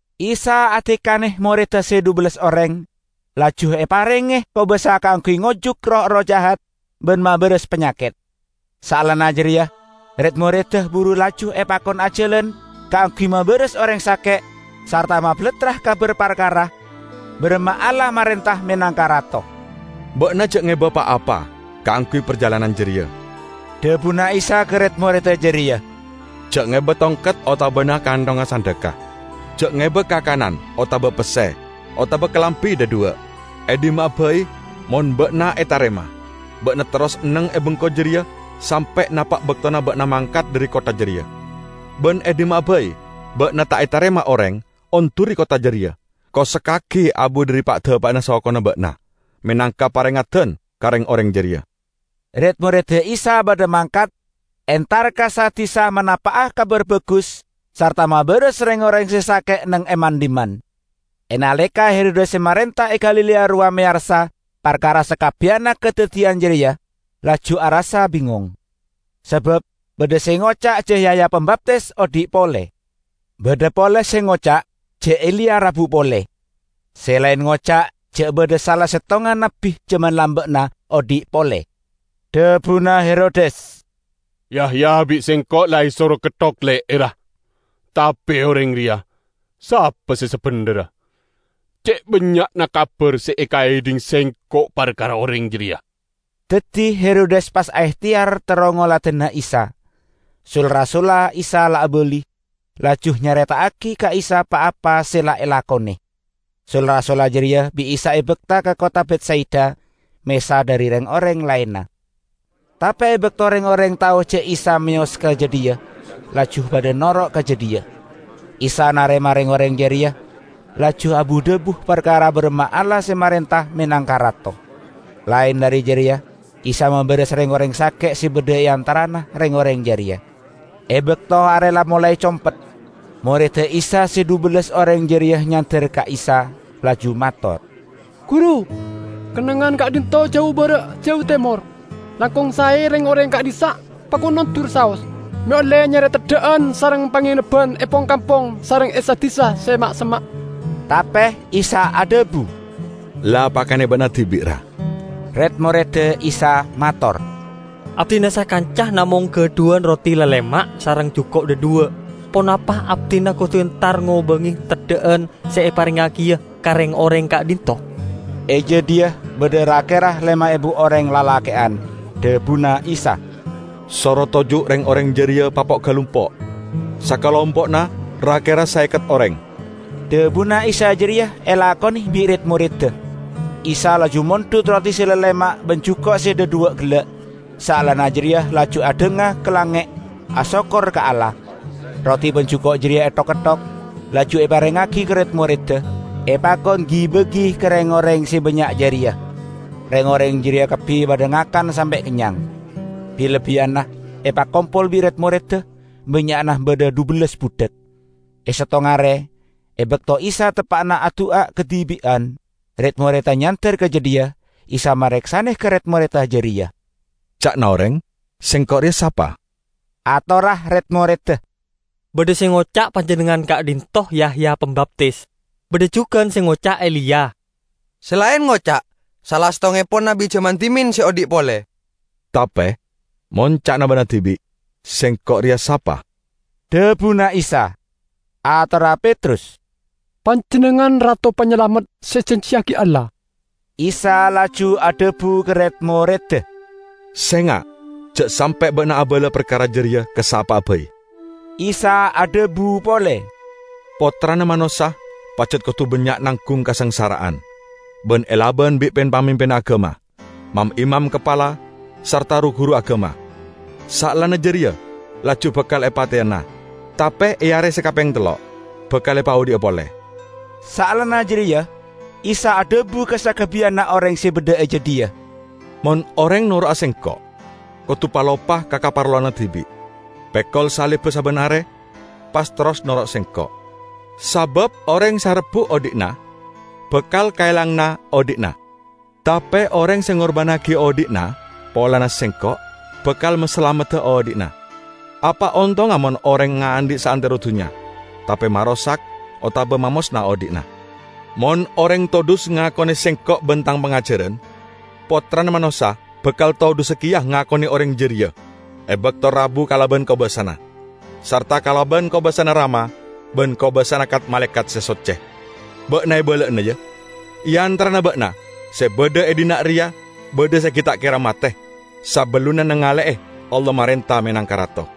Isa adikane moredda se dhubellas oreng, laju eparenge kobasa kaangguy ngojuk roh-erroh jahat ban mabaras panyaket. Saellana jareya red-moredda buru laju epakon ajalan kaangguy mabaras oreng sake' sarta mabalattra kabar parkara baramma Allah marenta menangka Rato. "Ba'na ja' ngeba pa-apa kaangguy parjalanan jareya," dhabuna Isa ka red-moredda jareya. "Ja' ngeba tongket otabana kanthongnga sandhekka, ja' ngeba kakanan otaba pesse, otaba kalambi dhadhuwa'. E dhimma'a bai mon ba'na etarema, ba'na terros neng e bengko jareya sampe' napa' baktona ba'na mangkat dhari kottha jareya. Ban e dhimma'a bai ba'na ta' etarema oreng, onduri kottha jareya, kosekkagi abu dhari pa'-dapa'na sokona ba'na, menangka parengeddan ka reng-oreng jareya." Red-moredda Isa padha mangkat, entar ka sa-disa manapa'a Kabar Bagus sarta mabaras reng-oreng se sake' neng e man-dhimman. E naleka Herodes se marenta e Galilea rowa meyarsa parkara sakabbiyanna kadaddiyan jareya, laju arassa bingong. Sabab badha se ngoca' ja' Yahya Pambaptis odhi' pole. Badha pole se ngoca' ja' Eliya rabu pole. Se laen ngoca' ja' badha sala settongnga nabbi jaman lamba'na odhi' pole. Dhabuna Herodes, "Yahya bi' sengko' la esoro ketthok le'erra. Tape oreng reya, sapa se sabendherra? Ce' bannya'na kabar se ekaedhing sengko' parkara Oreng jareya." Daddi Herodes pas aehteyar terro ngoladana Isa. Sul-rasulla Isa la abali, laju nyareta'agi ka Isa pa-apa se la elakone. Sul-rasulla jareya bi' Isa ebakta ka kottha Betsaida, mesa dhari reng-oreng laenna. Tape e bakto reng-oreng tao ja' Isa meyos ka jadhiya, laju padha noro' ka jadhiya. Isa narema reng-oreng jareya, laju abu-dhabu parkara baramma Allah se marenta menangka Rato. Laen dhari jareya Isa mabaras reng-oreng sake' se badha e antarana reng-oreng jareya. E bakto are la molae compet, moredda Isa se dhubellas oreng jareya nyander ka Isa laju mator, "Guru, kennengngan ka'dhinto' jau bara' jau temor. Langkong sae reng-oreng ka'dhissa' pakon ondur saos, me' olle nyare teddha'an sareng pangenebban e pong-kampong sareng e sa-disa se ma'-semma'." Tape Isa adhabu, "La pakane ba'na dibi', ra." Red-moredda Isa mator, "Abdina sakanca namong gadhuwan roti lalema' sareng juko' dhadhuwa'. Ponapa abdina kodu entar ngobange teddha'an se eparengngagiya ka reng-oreng ka'dhinto'?" (E jadhiya badha ra-kera lema ebu oreng lalake'an.) Dhabuna Isa, "Soro toju' reng-oreng jareya, papo'-galumpo', sakalompo'na ra-kera saeket oreng." Dhabuna Isa jareya elakone bi' red-moredda. Isa laju mondhut roti se lalema' ban juko' se dhadhuwa' gella', saellana jareya laju adhanga ka langnge', asokkor ka Allah. Roti ban juko' jareya ethok-ketthok, laju eparengngagi ka red-moredda, epakon gi-bagi ka reng-oreng se bannya' jareya. Reng-oreng jareya kabbi padha ngakan sampe' kennyang. Bi-lebbiyanna epakompol bi' red-moredda, bannya'na badha dhubellas budhak. E settong are, e bakto Isa teppa'na adu'a kadibi'an, red-moredda nyander ka jadhiya. Isa mareksane ka red-moredda jareya, "Ca'na oreng, Sengko' reya sapa?" Atorra red-moredda, "Badha se ngoca' Panjennengngan ka'dhinto' Yahya Pambaptis. Badha jugan se ngoca' Eliya, se laen ngoca' sala settongngepon nabbi jaman dhimen se odhi' pole." "Tape, mon ca'na ba'na dibi', Sengko' reya sapa?" dhabuna Isa. Atorra Petrus, "Panjennengngan Rato Panyalamet se ejanjiyagi Allah." Isa laju adhabu ka red-moredda, "Senga', ja' sampe' ba'na abala parkara jareya ka sapa'a bai." Isa adhabu pole, "Pottrana Manossa pajat kodu bannya' nanggung kasangsara'an ban elaban bi' pin-pamimpinna agama, mam-imam kapala sarta ru-guru agama. Saellana jareya laju bakal epateyana, tape e are se kapeng tello' bakal epaodhi'a pole." Saellana jareya Isa adhabu ka sakabbiyanna oreng se badha e jadhiya, "Mon oreng noro'a Sengko', kodu paloppa ka kaparlowanna dibi', pekol salibba sabban are, pas terros noro' Sengko'. Sabab oreng se arebbu' odhi'na bakal kaelangana odhi'na. Tape oreng se ngorbannagi odhi'na polana Sengko', bakal masalamedda odhi'na. Apa ontongnga mon oreng ngaandhi' saantero dunnya, tape marosak otaba mamosna odhi'na? Mon oreng todhus ngakone Sengko' ban Tang pangajaran, Pottrana Manossa bakal todhusa keya ngakone oreng jareya e bakto rabu kalaban kobasana, sarta kalaban kobasana Rama ban kobasana kat-malaekat se socce! Ba'na ebala'ana, ya: e antarana ba'na se badha e dhinna' reya badha se gi' ta' kera mate sabellunna nangale'e Allah marenta menangka rato."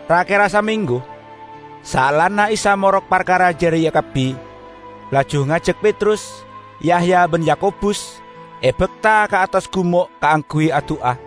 Ra-kera samenggu saellana Isa morok parkara jareya kabbi, laju ngajak Petrus, Yahya ban Yakobus, ebakta ka attas gumo' kaangguy adu'a.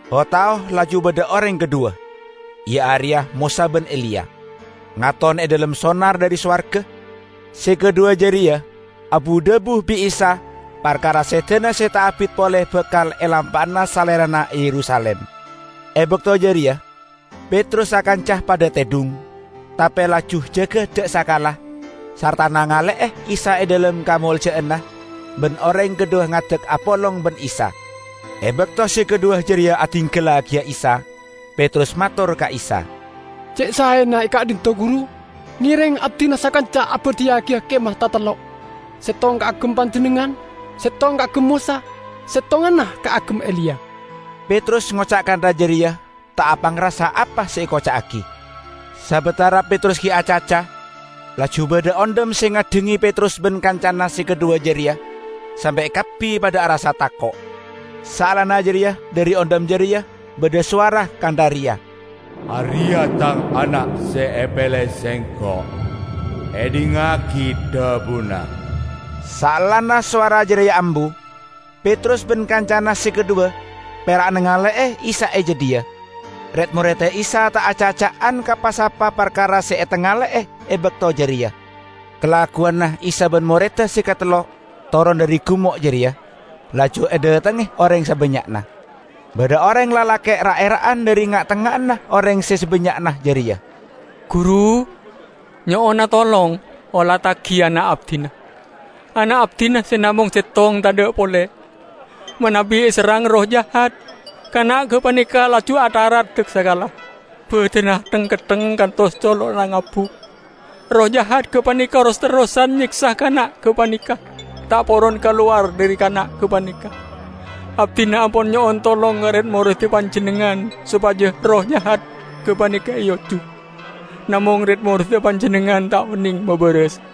O-tao laju badha oreng kadhuwa, iya areya Mosa ban Eliya, ngaton e dhalem sonar dhari sowarga. Se kadhuwa jareya abu-dhabu bi' Isa parkara sedana se ta' abit pole bakal elampa'ana Salerana e Yerusalim. E bakto jareya Petrus sakanca padha tedhung, tape laju jaga daksakala, sarta nangale'e Isa e dhalem kamolja'anna ban oreng kadhuwa ngadek apolong ban Isa. E bakto se kadhuwa jareya adinggallagiya Isa, Petrus mator ka Isa, "Ce' saena e ka'dhinto', Guru. Ngereng abdina sakanca abadhiyagiya kemah tatello': settong kaagem Panjennengngan, settong kaagem Mosa, settonganna kaagem Eliya." (Petrus ngoca' kantha jareya ta' apangrasa apa se ekoca'agi.) Sabatara Petrus gi' acaca, laju badha ondhem se ngaddhange Petrus ban kancana se kadhuwa jareya, sampe' kabbi padha arassa tako'. Saellana jareya dhari ondhem jareya badha sowara kantha reya, "Areya Tang Ana' se epele Sengko'. Edhingngagi dhabuna!" Saellana sowara jareya ambu, Petrus ban kancana se kadhuwa pera' nangale'e Isa e jadhiya. Red-moredda Isa ta' acaca'an ka pa-sapa parkara se etangale'e e bakto jareya. Kalagguwanna Isa ban moredda se katello toron dhari gumo' jareya, laju edhatengnge oreng sabannya'na. Badha oreng lalake' ra'-era'an dhari nga'-tengnga'anna oreng se sabannya'na jareya, "Guru, nyo'ona tolong olattagi ana' abdina -- ana' abdina se namong settong tadha' pole! Manabi eserrang erroh jahat, kana' gapaneka laju atharat daksakala, badanna theng-kettheng kantos colo'na ngabuk. Erroh jahat gapaneka ros-terrosan nyeksa kana' gapaneka, ta' poron kalowar dhari kana' gapaneka! Abdina ampon nyo'on tolong ka red-moredda Panjennengngan sopaja erroh jahat gapaneka eojuk, namong red-moredda Panjennengngan ta' oneng mabaras."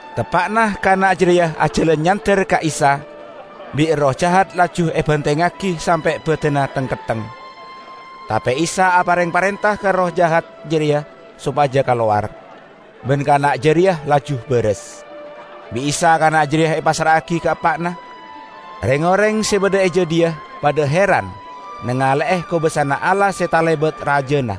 Teppa'na kana' jareya ajalan nyander ka Isa, bi' erroh jahat laju ebantengngagi sampe' badanna theng-kettheng. Tape Isa apareng parenta ka erroh jahat jareya sopaja kalowar, ban kana' jareya laju baras. Bi' Isa kana' jareya epassra'agi ka eppa'na. Reng-oreng se badha e jadhiya padha heran nangale'e kobasana Allah se talebat rajana.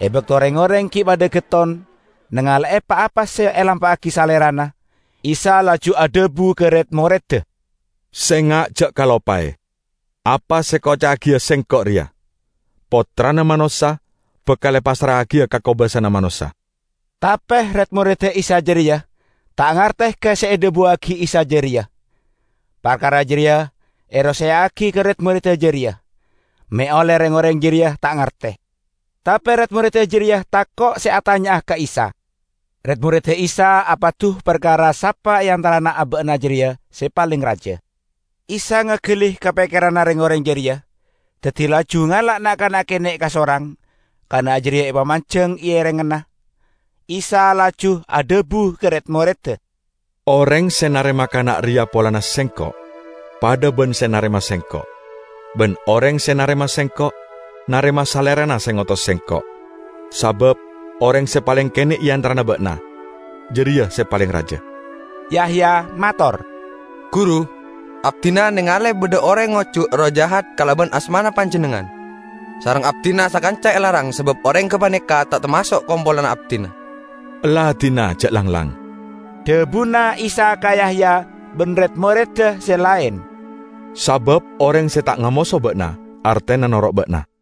E bakto reng-oreng gi' padha getton nangale'e pa-apa se elampa'agi Salerana, Isa laju adhabu ka red-moredda, "Senga' ja' kaloppae apa se ekoca'agiya Sengko' reya: Pottrana Manossa bakal epassra'agiya ka kobasana manossa." Tape red-moredda Isa jareya ta' ngarte ka se edhabuwagi Isa jareya. Parkara jareya eroseya'agi ka red-moredda jareya, me' olle reng-oreng jareya ta' ngarte. Tape red-moredda jareya tako' se atanya'a ka Isa. Red-moredda Isa apadu parkara sapa e antarana aba'na jareya se paleng raja. Isa ngagali ka pekkeranna reng-oreng jareya, daddi laju ngala' na'-kana' kene' kasorang; kana' jareya epamanjeng e erengnganna. Isa laju adhabu ka red-moredda, "Oreng se narema kana' reya polana Sengko', padha ban se narema Sengko'. Ban oreng se narema Sengko', narema Salerana se ngotos Sengko'. Sabab oreng se paleng kene' e antarana ba'na, jareya se paleng raja!" Yahya mator, "Guru, abdina nengale badha oreng ngojuk erroh jahat kalaban asmana Panjennengngan, sareng abdina sakanca elarang sabab oreng gapaneka ta' tamaso' kompolanna abdina." "Ella dina ja' langlang," dhabuna Isa ka Yahya ban red-moredda se laen, "sabab oreng se ta' ngamoso ba'na artena noro' ba'na."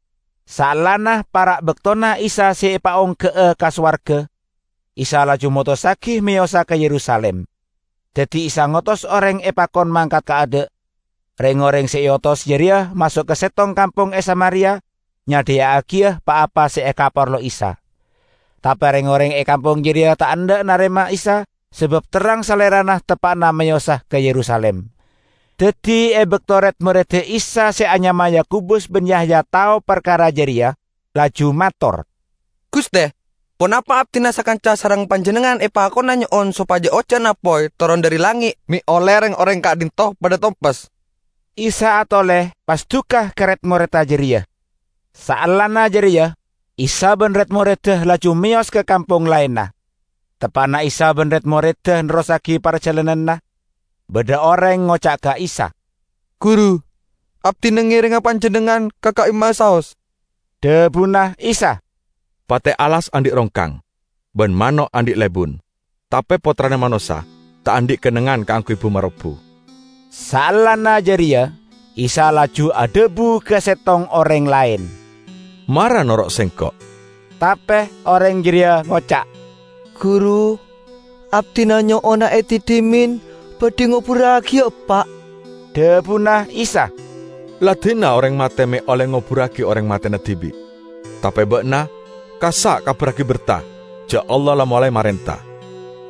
Saellana para' baktona Isa se epaongga'a ka sowarga, Isa laju motossagi meyosa ka Yerusalim. Daddi Isa ngotos oreng epakon mangkat kaadha'. Reng-oreng se eotos jareya maso' ka settong kampong e Samaria nyadhiya'agiya pa-apa se ekaparlo Isa. Tape reng-oreng e kampong jareya ta' endha' narema Isa sabab terrang Salerana teppa'na meyosa ka Yerusalim. Daddi e bakto red-moredda Isa se anyama Yakobus ban Yahya tao parkara jareya, laju mator, "Guste, ponapa abdina sakanca sareng Panjennengngan epakona nyo'on sopaja ojan apoy toron dhari langnge' me' olle reng-oreng ka'dhinto' padha tompes?" Isa atole pas duka ka red-moredda jareya. Saellana jareya Isa ban red-moredda laju meyos ka kampong laenna. Teppa'na Isa ban red-moredda nerrossagi parjalananna, badha oreng ngoca' ka Isa, "Guru, abdina ngerenga Panjennengngan ka ka'imma'a saos!" Dhabuna Isa, "Pate' alas andhi' rongkang, ban mano' andhi' lebun, tape Pottrana Manossa ta' andhi' kennengngan kaangguy bu-marobbu." Saellana jareya Isa laju adhabu ka settong oreng laen, "Mara noro' Sengko'." Tape oreng jareya ngoca', "Guru, abdina nyo'ona edi dhimen, badhi ngoburragi eppa'." Dhabuna Isa, "La dina oreng mate me' olle ngoburragi oreng matena dibi'. Tape ba'na, kassa' kabarragi berta ja' Allah la molae marenta."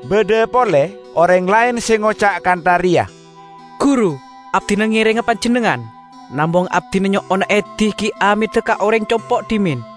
Badha pole oreng laen se ngoca' kantha reya, "Guru, abdina ngerenga Panjennengngan, namong abdina nyo'ona edi gi' ameda ka oreng compo' dhimen."